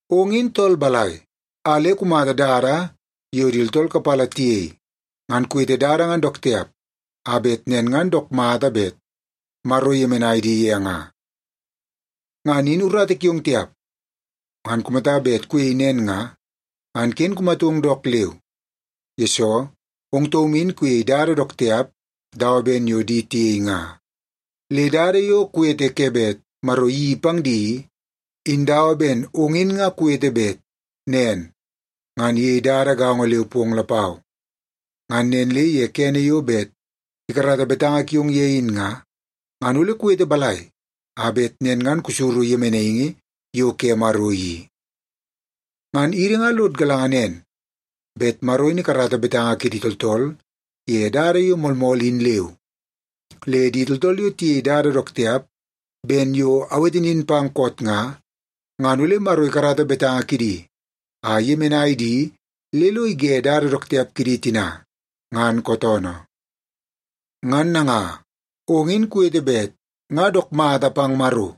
Ong in tool balai a le kumata dada yo di tooltool kapala tiyei, ngan kuwete dada ngan dook tiap a bet nen ngan dook mata bet Maro iyemenai di ye nga? Ngan in urata kiong tiap! Ngan kumata bet kuyei nen nga, ngan ken kumatong dook leu, yesoo ong taum in kuyei dada dook tiap dawa ben yo di tiyei nga. Le dada yo kuwete ke bet Maro iyeii pang di i, in dawa ben ong in nga kuwete bet nen ngan iyei dada gaongo leu pong lapau. Ngan nen le ye kene yo bet ikarata betanga kiong ye in nga, ngan ole kuwete balai a bet nen ngan kusuru yemenaingi yo ke Maro i? Ngan idi nga lod galanga nen, bet Maro in ikarata betanga kidi tooltool ye dada yo moolmool in leu. Le di tooltool yo tiyei dada dook tiap ben yo awete nin pang koot nga, ngan ole Maro ikarata betanga kidi a iyemenai di le lo ige dada dook tiap kidi tina ngan kootoonoo. Ngan nanga, ong in kuwete bet nga dook mata pang Maro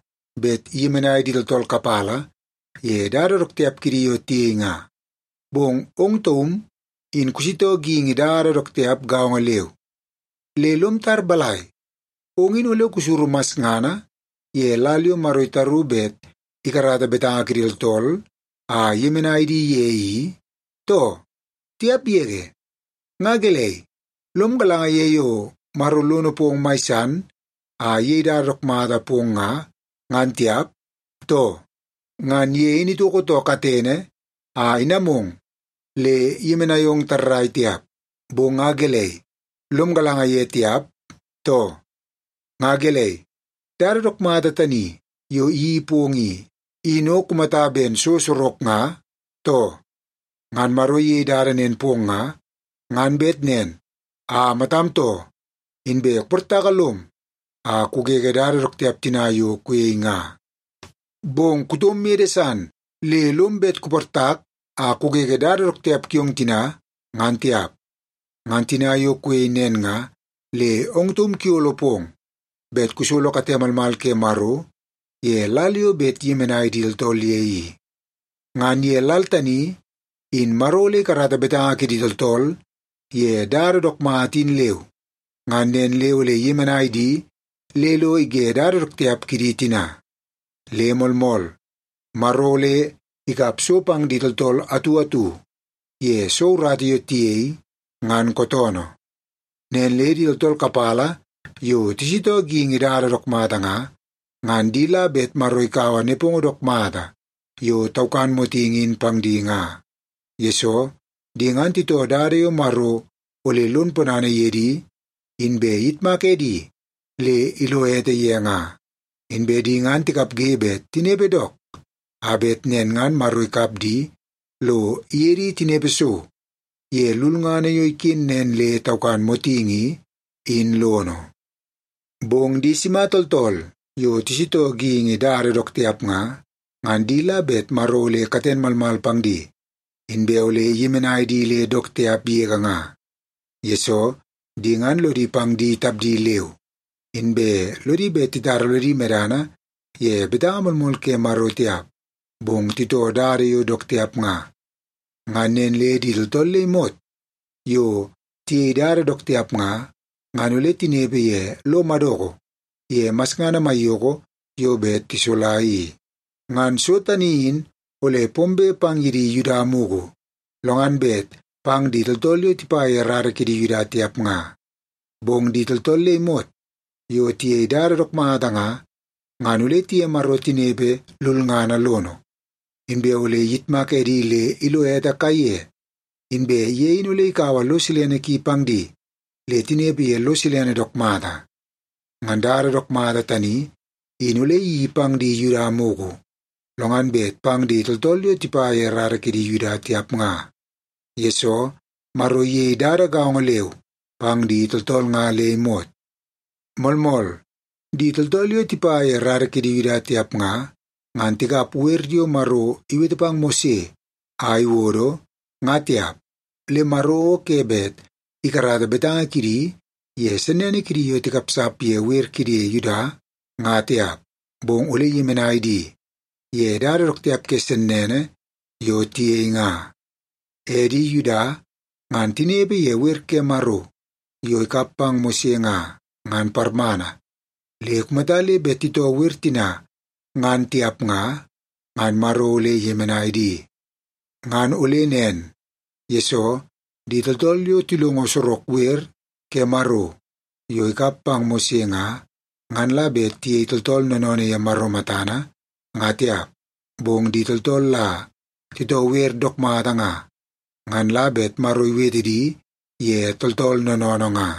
bet iyemenai di tooltool kapala ye dada dook tiap kidi yo tiyei nga, bong ong taum in kusitoo geingi dada dook tiap gaongo leu. Le lom tar balai, ong in ole kusuru masngana ye lal yo Maro itaru bet ikarata betanga kidi tooltool a iyemenai di ye i, too? Tiap yege! Nga gelei, lom galanga ye yo Maro lono pong mai san a iyei dada dook mata pong nga, ngan tiap, too? Ngan ye in itoko too katene a inamong le iyemenai ong tarrai tiap, bong nga gelei, lom galanga ye tiap, too? Nga gelei, dada dook mata tani yo iyeii pong i, in o kumata ben so sorok nga, too? Ngan Maro iyei dada nen pong nga, ngan bet nen a matam too, inbe kuportaka lom a kugege dada dook tiap tina yo kuyei nga. Bong kutom mede san le lom bet kuportak a kugege dada dook tiap kiong tina, ngan tiap. Ngan tina yo kuyei nen nga, le ong taum kuyolo pong bet kusolo kate malmal ke Maro ye lal yo bet iyemenai di tooltool ye i. Ngan ye lal tani, in Maro ole ikarata betanga kidi tooltool ye dada yo dook mata in leu, ngan nen le ole iyemenai di le lo ige dada dook tiap kidi tina. Le moolmool, Maro ole ikap so pang di tooltool atu atu ye soo urata yo tiyei, ngan kootoonoo. Nen le di tooltool kapala yo tisitoo geingi dada dook mata nga, ngan di la bet Maro ikaua nepongo dook mata yo taukan motingi in pang di nga. Yesoo, di ngan titoo dada yo Maro ole lon ponana ye di, inbe iyitmak edi le ilo ete ye nga. Inbe di ngan tikapge bet tinepe dook, a bet nen ngan Maro ikap di lo iye di tinepe so ye lulngana yo iken nen le taukan motingi i, in lono. Bong di sima tooltool yo tisitoo geingi dada dook tiap nga, ngan di la bet Maro ole katen malmal pang di inbe ole iyemenai di le dook tiap yege nga. Yesoo, di ngan lodi pang di tapdi leu, inbe lodi bet titara lodi medana ye betanga moolmool ke Maro tiap, bong titoo dada yo dook tiap nga. Ngan nen le di tooltool le imot yo tiyei dada dook tiap nga, ngan ole tinepe ye lo madoko ye masngana maiyoko yo bet tisola i. Ngan so tani in ole pombe pang di Yuda mugu, lo ngan bet pang di tooltool yo tipa ye rara kidi Yuda tiap nga. Bong di tooltool le imot yo tiyei dada dook mata nga, ngan ole tiye Maro tinepe lulngana lono. Inbe ole iyitmak edi le ilo ete kaiye, inbe ye in ole ikaua lo silene ki pang di le tinepe ye lo silene dook mata. Ngan dada dook mata tani, in ole iyeii pang di Yuda mugu, lo ngan bet pang di tooltool yo tipa ye rara kidi Yuda tiap nga. Yesoo, Maro iyei dada gaongo leu pang di tooltool nga le imot. Moolmool, di tooltool yo tipa ye rara kidi Yuda tiap nga, ngan tikap wer yo Maro iwete pang Mose a iwodo, nga tiap. Le Maro o ke bet ikarata betanga kidi ye sennene kidi yo tikapsap ye wer kidi Yuda, nga tiap, bong ole iyemenai di ye dada dook tiap ke sennene yo tiyei nga. E di Yuda, ngan tinepe ye wer ke Maro yo ikap pang Mose nga, ngan parmana, le kumata le bet titoo wer tina ngan tiap nga, ngan Maro ole iyemenai di. Ngan ole nen, yesoo di tooltool yo tilongo sorok wer ke Maro yo ikap pang Mose nga, ngan la bet tiyei tooltool noonoonoo ye Maro matana, nga tiap, bong di tooltool la titoo wer dook mata nga, ngan la bet Maro iwete di ye tooltool noonoonoo nga.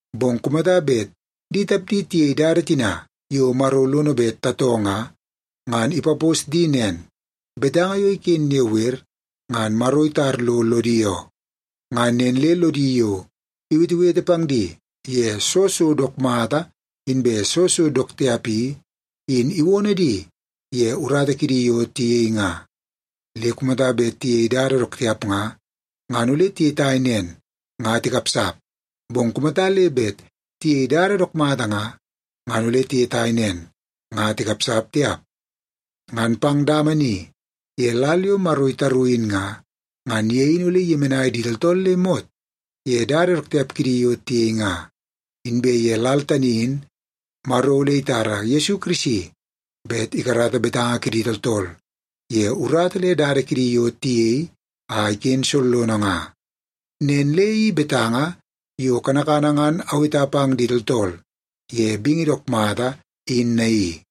bong kumata bet di tapdi tiyei dada tina yo Maro lono bet tatoo nga, ngan ipapos di nen; betanga yo iken ye wer ngan Maro itar lo lodi oo. Ngan nen le lodi yo iwetewete pang di ye soo so dook mata inbe soo so dook tiap i, in iwono di ye urata kidi yo tiyei nga. Le kumata bet tiyei dada dook tiap nga, ngan ole tiyetai nen nga tikapsap. Bong kumata le bet tiyei dada dook mata nga, ngan ole tiyetai nen nga tikapsap tiap. Ngan pang dama ni ye lal yo Maro itaru in nga, ngan ye in ole iyemenai di tooltool le imot ye dada dook tiap kidi yo tiyei nga. Inbe ye lal tani in Maro ole itara Yesu Kirisi bet ikarata betanga kidi tooltool ye urata le dada dook tiap kidi yo tiyei a iken sollono nga. Nen le i betanga yo kanakana ngan aweta pang di tooltool ye bingi dook mata, in naii.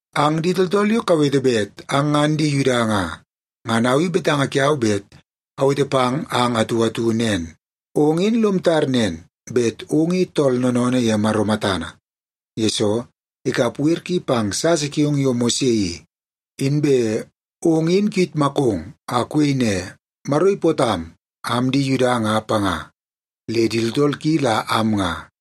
Ang di tooltool yo kawete bet ang ngan di Yuda nga, ngan au i betanga kiau bet awete pang ang atu atu nen. Ong in lom tar nen bet ong i tool noonoonoo ye Maro matana, yesoo ikap wer ki pang sasa kiong yo Mose i. Inbe ong in kuyitmakong a kuyei ne, “Maro ipootam am di Yuda nga panga, le di tooltool ki la am nga.”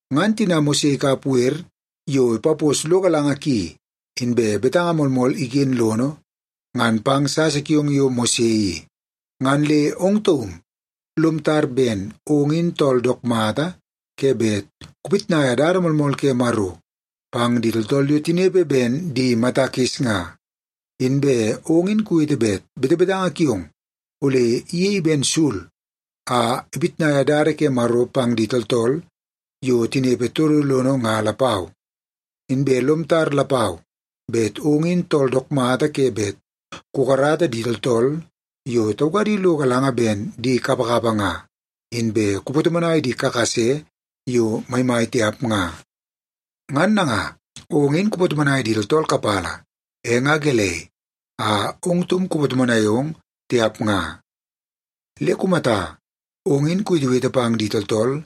Ngan tina Maro ikap wer yo ipaposo lo galanga ki, inbe betanga moolmool iken lono, ngan pang sasa kiong yo Mose i, ngan le ong taum lom tar ben ong in tool dook mata ke bet kupitnaia dada moolmool ke Maro pang di tooltool yo tinepe ben di mata kis nga. Inbe ong in kuwete bet betebetanga kiong ole iyei ben sul a ipitnaia dada ke Maro pang di tooltool yo tinepe todo lono nga lapau. Inbe lom tar lapau bet ong in tool dook mata ke bet kukarata di tooltool yo taukadi lo galanga ben di kapakapa nga, inbe kupatomonai di kakase yo maimai tiap nga. Ngan nanga, ong in kupatomonai di tooltool kapala, e nga gelei a ong taum kupatomonai ong tiap nga? Le kumata, ong in kuwetewete pang di tooltool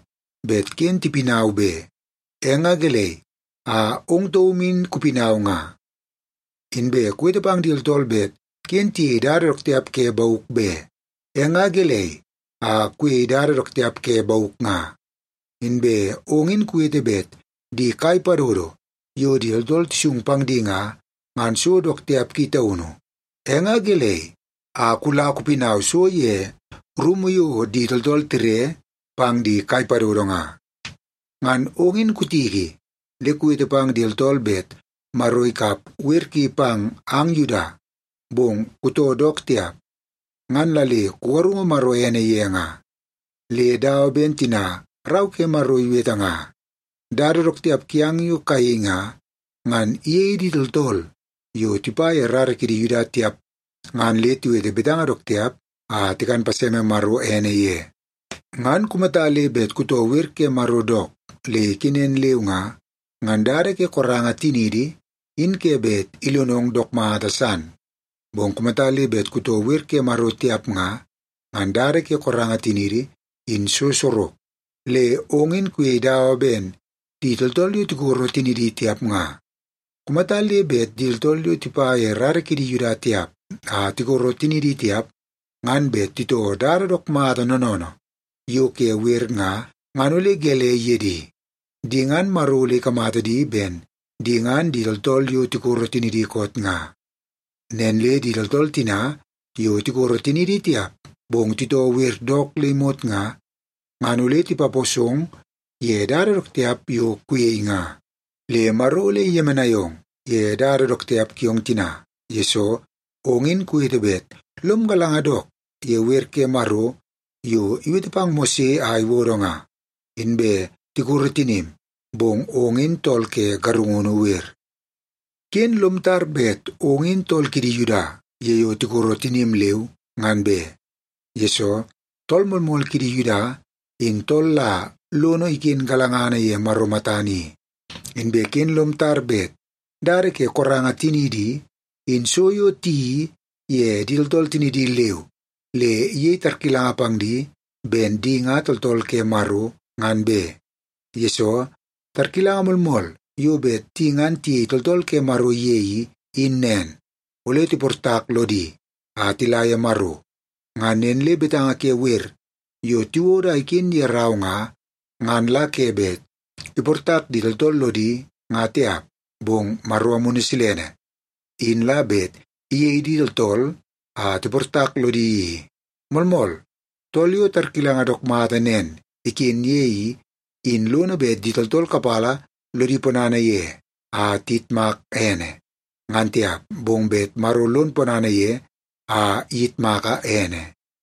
bet ken tipinau be, e nga gelei a ong taum in kupinau nga? Inbe kuwete pang di tooltool bet ken tiyei dada dook tiap ke bauk be, e nga gelei a kuyei dada dook tiap ke bauk nga? Inbe ong in kuwete bet di kai padodo yo di tooltool tisung pang di nga, ngan so dook tiap ki taunu, e nga gelei a kula kupinau so ye rumu yo di tooltool tire pang di kai padodo nga? Ngan ong in kutiki le kuwete pang di tooltool bet Maro ikap wer ki pang ang Yuda, bong kutoo dook tiap, ngan la le kugarungu Maro ene ye nga. Le dawa ben tina Rau ke Maro iwete nga, “Dada dook tiap kiang yo kayei nga, ngan iyei di tooltool yo tipa ye rara kidi Yuda tiap, ngan le tiwete betanga dook tiap a tikan paseme Maro ene ye.” Ngan kumata le bet kutoo wer ke Maro dook le ikenen leu nga, ngan dada ke koranga tiniidi in ke bet ilonong dook mata san. Bong kumata le bet kutoo wer ke Maro tiap nga, ngan dada ke koranga tiniidi in so sorok, le ong in kuyei dawa ben di tooltool yo tikoro tinidi tiap nga. Kumata le bet di tooltool yo tipa ye rara kidi Yuda tiap a tikoro tinidi tiap, ngan bet titoo dada dook mata noonoonoo yo ke wer nga, ngan ole gelei ye di? Di ngan Maro ole ikamata di ben di ngan di tooltool yo tikoro tinidi koot nga. Nen le di tooltool tina yo tikoro tinidi tiap, bong titoo wer dook le imot nga, ngan ole tipaposong ye dada dook tiap yo kuyei nga. Le Maro ole iyemenai ong ye dada dook tiap kiong tina, yesoo ong in kuwete bet lom galanga dook ye wer ke Maro yo iwete pang Mose a iwodo nga, inbe tikoro tinim, bong ong in tool ke garungunu wer. Ken lom tar bet ong in tool kidi Yuda ye yo tikoro tinim leu, ngan be. Yesoo, tool moolmool kidi Yuda, in tool la lono iken galangana ye Maro matana i. Inbe ken lom tar bet dada ke koranga tiniidi i, in so yo tiyeii ye di tooltool tinidi leu le iyei tarkilanga pang di ben di nga tooltool ke Maro, ngan be. Yesoo, tarkilanga moolmool yo bet di ngan tiyei tooltool ke Maro ye i, in nen; ole tiportak lodi a tila ye Maro. Ngan nen le betanga ke wer yo tiwodo a iken ye rau nga, ngan la ke bet iportak di tooltool lodi nga tiap, bong Maro Amunu Silene, in la bet iyei di tooltool a tiportak lodi i. Moolmool, tool yo tarkilanga dook mata nen iken ye i, in lono bet di tooltool kapala lodi ponana ye a tiyitmak ene, ngan tiap, bong bet Maro lon ponana ye a iyitmaka ene.